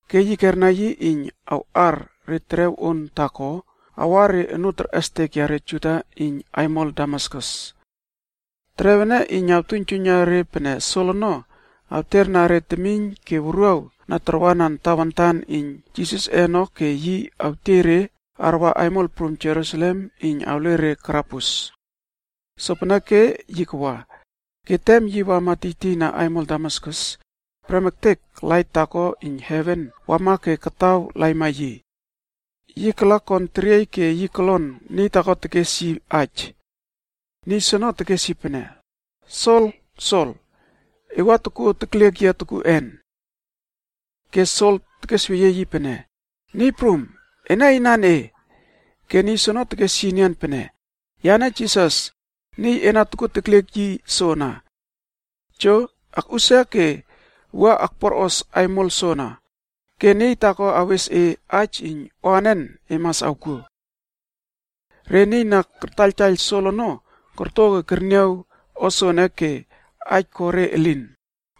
Ke yi kerna yi iyn awꞌar re terew on taako awa re onoo terꞌestek yare Juda iyn aimol Damaskus. Terew ene iyn awtuiynjuiyna re pene Sol ono awterna re temiyn ke wuruaw na tarwanan Tawantana iyn Jisasꞌe ono ke yi awtiey re arwa aimol prum Jerusalem iyn awle re karabus. Sopeneke yi kawa, ke tem yi wama tiytiyna aimol Damaskus, prem ektek lait taako iyn heven wama ke kataw laima yi. Yi kala kon teriey ke yi kolon niy taako tekes yi aij. Niy soono tekes yi pene, “Sol, Sol! E wua tokuo tekliek yia tokuꞌen?” Ke Sol tekesweyie yi pene, “Niy Prum, ena inan e?” Ke niy soono tekes yi enian pene, “Yane Jisas, niy e na tokuo tekliek yi soana. Jo! Akꞌusia ke wua akpuarꞌos aimol soana, ke niy taako awes e aij iyn o anen e mas awkuo.” Re niy na kartaiyltaiyl Sol ono korto ke kerniaw o soene ke aij ko re elin,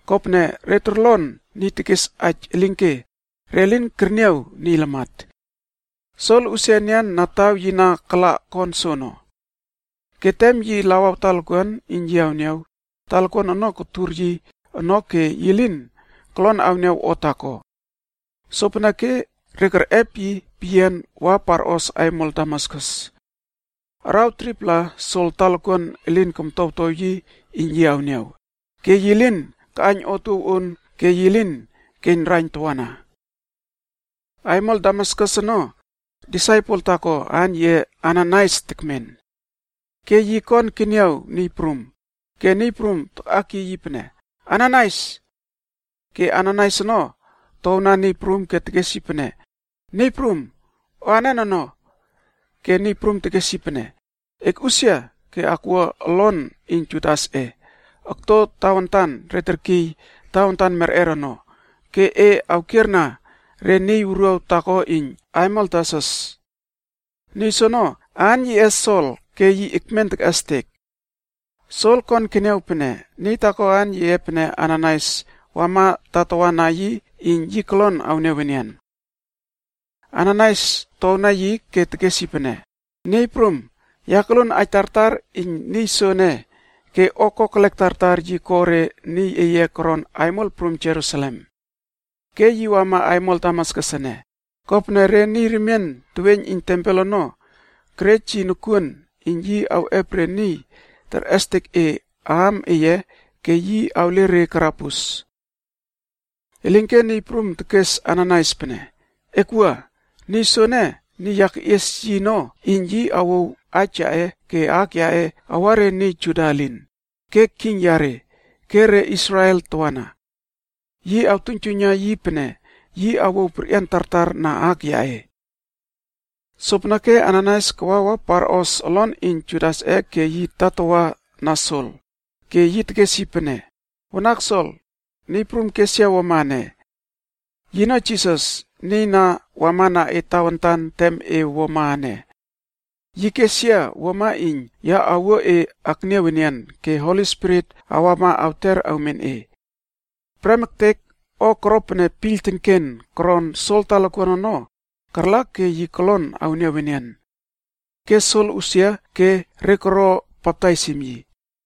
kopene re torlon niy tekes aij elinke re lin kerniaw niy lamat. Sol usia enian na taw yi na kala kon soono. Ke tem yi lawaw talokuan iyn yi awniaw, talokuan ono kotur yi ono ke yi lin kolon awniaw o taako. Sopeneke re kerꞌep yi peyian wa parꞌos aimol Damaskus. Araw 3-pla Sol talokuan elin komtowtow yi iyn yi awniaw, ke yi lin kaꞌaiyn otuow on ke yi lin keiyn raiyn tawana. Aimol Damaskus ono, disaipel taako aan yiꞌe Ananaias tekmen. Ke yi kon keniaw Niy Prum, ke Niy Prum takꞌakiy yi pene, “Ananaias.” Ke Ananaias ono towna Niy Prum ke tekes yi pene, “Niy Prum, O anen ono?” Ke Niy Prum tekes yi pene, “E akꞌusia ke akwua olon iyn Judasꞌeb okto tawantan re terkiy Tawantan Merꞌer ono, ke e awkierna re niy wuruaw taako iyn aimol Tarsus. Niy soono aan yiꞌe Sol ke yi ekmen tekꞌestek. Sol kon keniaw pene niy taako aan yiꞌe pene Ananaias wama tatawa na yi iyn yi kolon awniaw enian.” Ananaias towpaijna yi ke tekes yi pene, “Niy Prum, ya koluon aij tartar iyn niy soene ke re o kokelek tartar pene yi ko re niy iyn Godꞌe koron aimol prum Jerusalem ono. Ke yi wama aimol Damaskus ene, kopene re niy remien teweiyn iyn tempel ono kerej yi nokuon iyn yi awꞌep re niy na terꞌestek e aam eye ono ke awle re karabus.” Elinke Niy Prum tekes Ananaias pene, “Ekwua! Niy soene niy ya keꞌies yi ono iyn yi awouw aij yaꞌe ke aak yaꞌe awa re niy Juda elin, ke king yare, ke re Israel tawana. Ya awtuiynjuiyna yi pene yi awouw perꞌian tartar na aak yaꞌe.” Sopeneke Ananaias kawa wa parꞌos olon iyn Judasꞌe ke yi tatawa na Sol, ke yi tekes yi pene, “Wanak Sol, Niy Prum kes yia wuama ene. Yino Jisas, niy na wamana e tawantan tem e wuama ene. Yi kes yia wuama iyn ya awuo e akniaw enian ke Holi Spirit awama awter awmen e.” Prem ektek o koro pene piyl tenken koron Sol talokuan ono, karla ke yi kolon awniaw enian. Ke Sol usia ke re koro baptaisim yi.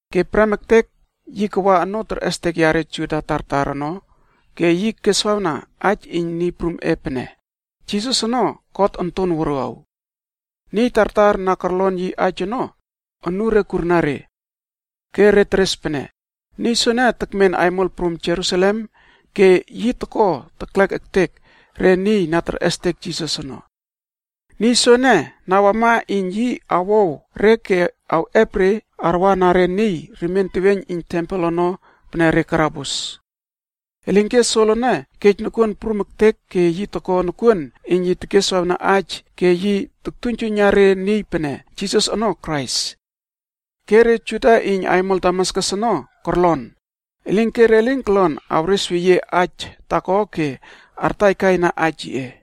Ke prem ektek yi kawa onoo terꞌestek yare Juda tartar ono ke yi keswawna aij iyn Niy Prumꞌe pene, Jisas ono God Onton Wuruaw. Niy tartar na korlon yi aij ono, unure kurna re. Ke re teres pene, “Niy soene tekmen aimol prum Jerusalem ke yi toko teklek ektek re niy na terꞌestek Jisas ono. Niy soene na wama iyn yi awow re ke awꞌep re arwana re niy remien teweiyn iyn tempel ono pene re karabus.” Elinke Sol ono kej nokuon prum ektek ke yi toko nokuon iyn yi tekeswawna aij ke yi toktuiynjuiyna re niy pene Jisas ono Krais. Ke re Juda iyn aimol Damaskus ono korlon, elinke re lin korlon awresweyie aij taako ke artaikaina aij yiꞌe.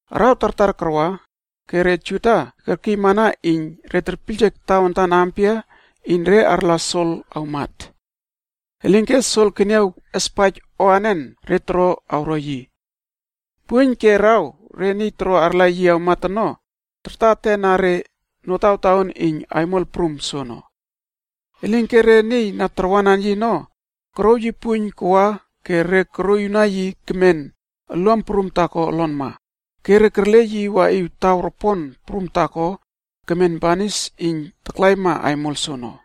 Araw tartar karwa, ke re Juda kerkiymana iyn re terpiyljek tawantan ampia iyn re arla Sol awmat. Elinke Sol keniaw espaij o anen re toro awro yi. Puiyn ke araw re niy toro arla yi awmat ono, tarta etena re notawtaon iyn aimol prum soono. Elinke re niy na tarwanan yi ono, korouw yi puiyn kawa ke re koroꞌiwna yi kemen oluam prum taako olonma, ke re kerle yi waꞌiw taw ropon prum taako kemen banis iyn taklaima aimol soono.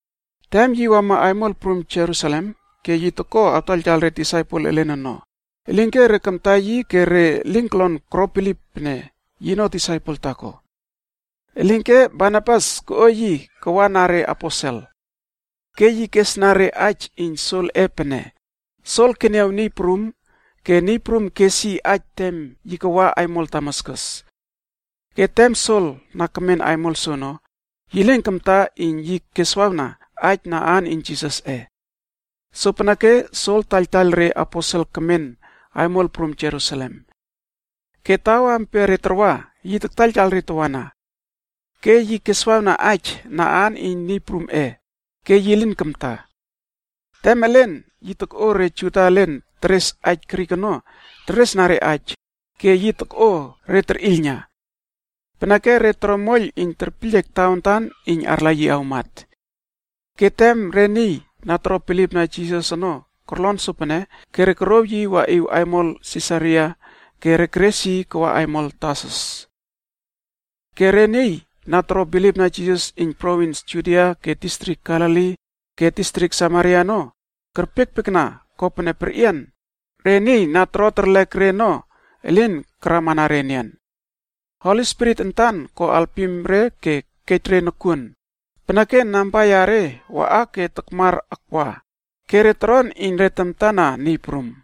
Tem yi wama aimol prum Jerusalem ke yi toko awtaiyltaiyl re disaipel elen ono, elinke re kamta yi ke re lin koro bilip pene yino disaipel taako. Elinke Barnabas koꞌo yi kawa na reaposel. Ke yi kesna re aij iyn Solꞌe pene, “Sol keniaw Niy Prum ke Niy Prum kes yi aij tem yi kawa aimol Damaskus. Ke tem Sol na kemen aimol soono, yi lin kamta iyn yi keswawna aij na aan iyn Jisasꞌe.” Sopeneke Sol taiyltaiyl re aposel kemen aimol prum Jerusalem. Ke taw ampia re tarwa, yi taiyltaiyl re tawana. Ke yi keswawna aij na aan iyn Niy Prumꞌe, ke yi lin kamta. Tem elen yi tokꞌo re Juda elen teres aij Grik ono teresna re aij, ke yi tokꞌo re terꞌiylna. Peneke re toro moiyl iyn terpiyljek tawantan iyn arla yi awmat. Ke tem re niy na toro bilipna Jisasc ono korlon sopene ke re korouw yi waꞌiw aimol Sisaria ke re keres yi kawa aimol Tarsus. Ke re niy na toro bilipna Jisas iyn provins Judia ke distrik Galili ke distrik Samaria ono kerpiekpiekna kopene perꞌian re niy na toro terlek re ono elin karamana re enian. Holi Spirit antan ko alpim re ke kej re nokuon, peneke namba yare waꞌa ke takmar akwa ke re toron iyn re tamta na Niy Prum.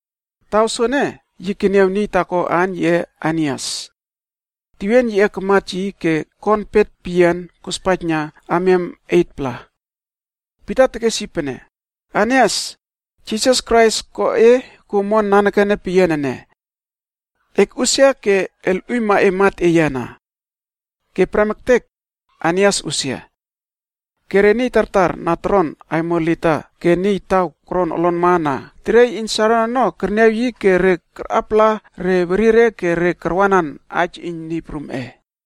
Taw soene yi keniaw niy taako aan yiꞌe Ainias. Tewien yiꞌe kamat yi ke kon pet peyian kospaijna amiam 8-pla. Pita tekes yi pene, “Ainias! Jisas Krais ko e kuo omon nanekene peyian ene. Ekꞌusia ke elꞌuiyma e mat eye ana.” Ke prem ektek Ainias usia. Re niy tartar na toron aimol Lida ke iyn taw koron olonma na teriey iyn Saron ono kerniaw yi ke re karꞌapala re werire ke re karwanan aij iyn Niy Prumꞌe.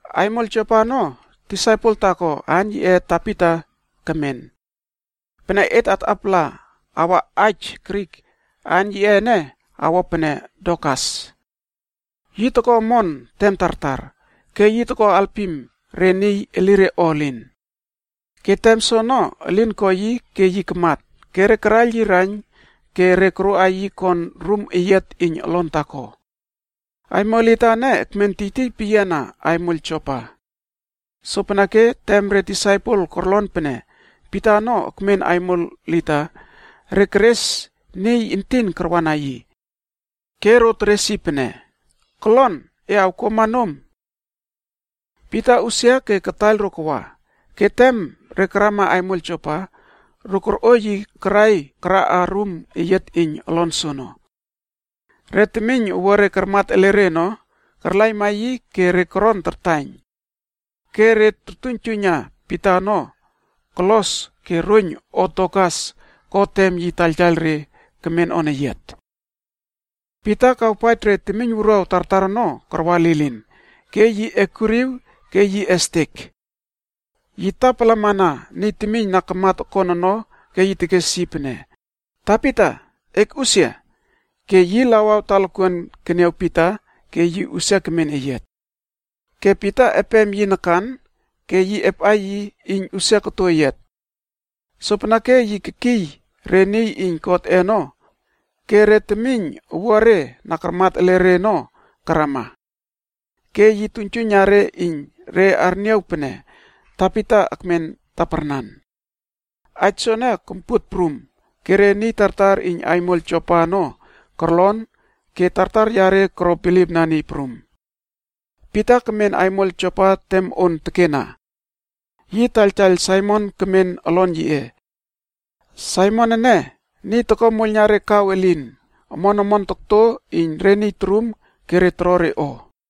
Aimol Jopa ono disaipel taako aan yiꞌe Tabita kemen. (Pene et atꞌapala awa aij Grik, aan yiꞌe ene awo pene Dorkas.) Yi toko omon tem tartar, ke yi toko alpim re niy elire o elin. Ke tem soono elin ko yi ke yi kamat ke re karaiyl yi raiyn ke re koroꞌa yi kon rum eyiat iyn olon taako. Aimol Lida ene ekmen tiytiy peyiana aimol Jopa. Sopeneke tem re disaipel ono korlon pene Pita ono ekmen aimol Lida, re keres niy entin karwana yi. Ke ro keres empema yi pene, “Kolon e awkuamana et nom!” Pita usia ke kataiyl ro kawa, ke tem re karama aimol Jopa, re korꞌo yi karai karaꞌa rum eyiat iyn olon soono. Re temiyn owuare karmat ele re ono, karlaima yi ke re korto tartaiyn. Ke re tortuiynjuiyna Pita ono, kolos ke roiyn o Dorkas ko tem yi taiyltaiyl re kemen oneyiat. Pita kawpaij re temiyn wuruaw tartar ono karwa lilin, ke yi ekuriw ke yi estek. Yi tapalamana niy temiyn na kamat okon ono ke yi tekes yi pene, “Tabita, ekꞌusia.” Ke yi lawaw talokuan keniaw Pita ke yi usia kemen eyiat. Ke Pita epem yi nakan ke yi epꞌa yi iyn usia koto eyiat. Sopeneke yi kekiy re temiynwuruaw na toro bilip ektekna God ono ke re temiyn owuare na karmat ele re ono karama. Ke yi tuiynjuiyna re iyn re arniaw pene Tabita ekmen taparnan. Aij soene kompuot prum, ke re niy tartar iyn aimol Jopa ono korlon ke tartar yare koro bilipna Niy Prum. Pita kemen aimol Jopa tem on tekena. Yi taiyltaiyl Saimon kemen olon yiꞌe. Saimon ene, niy toko moiyl na re kaw elin omon omon tokto iyn re niy torum ke re toro re o.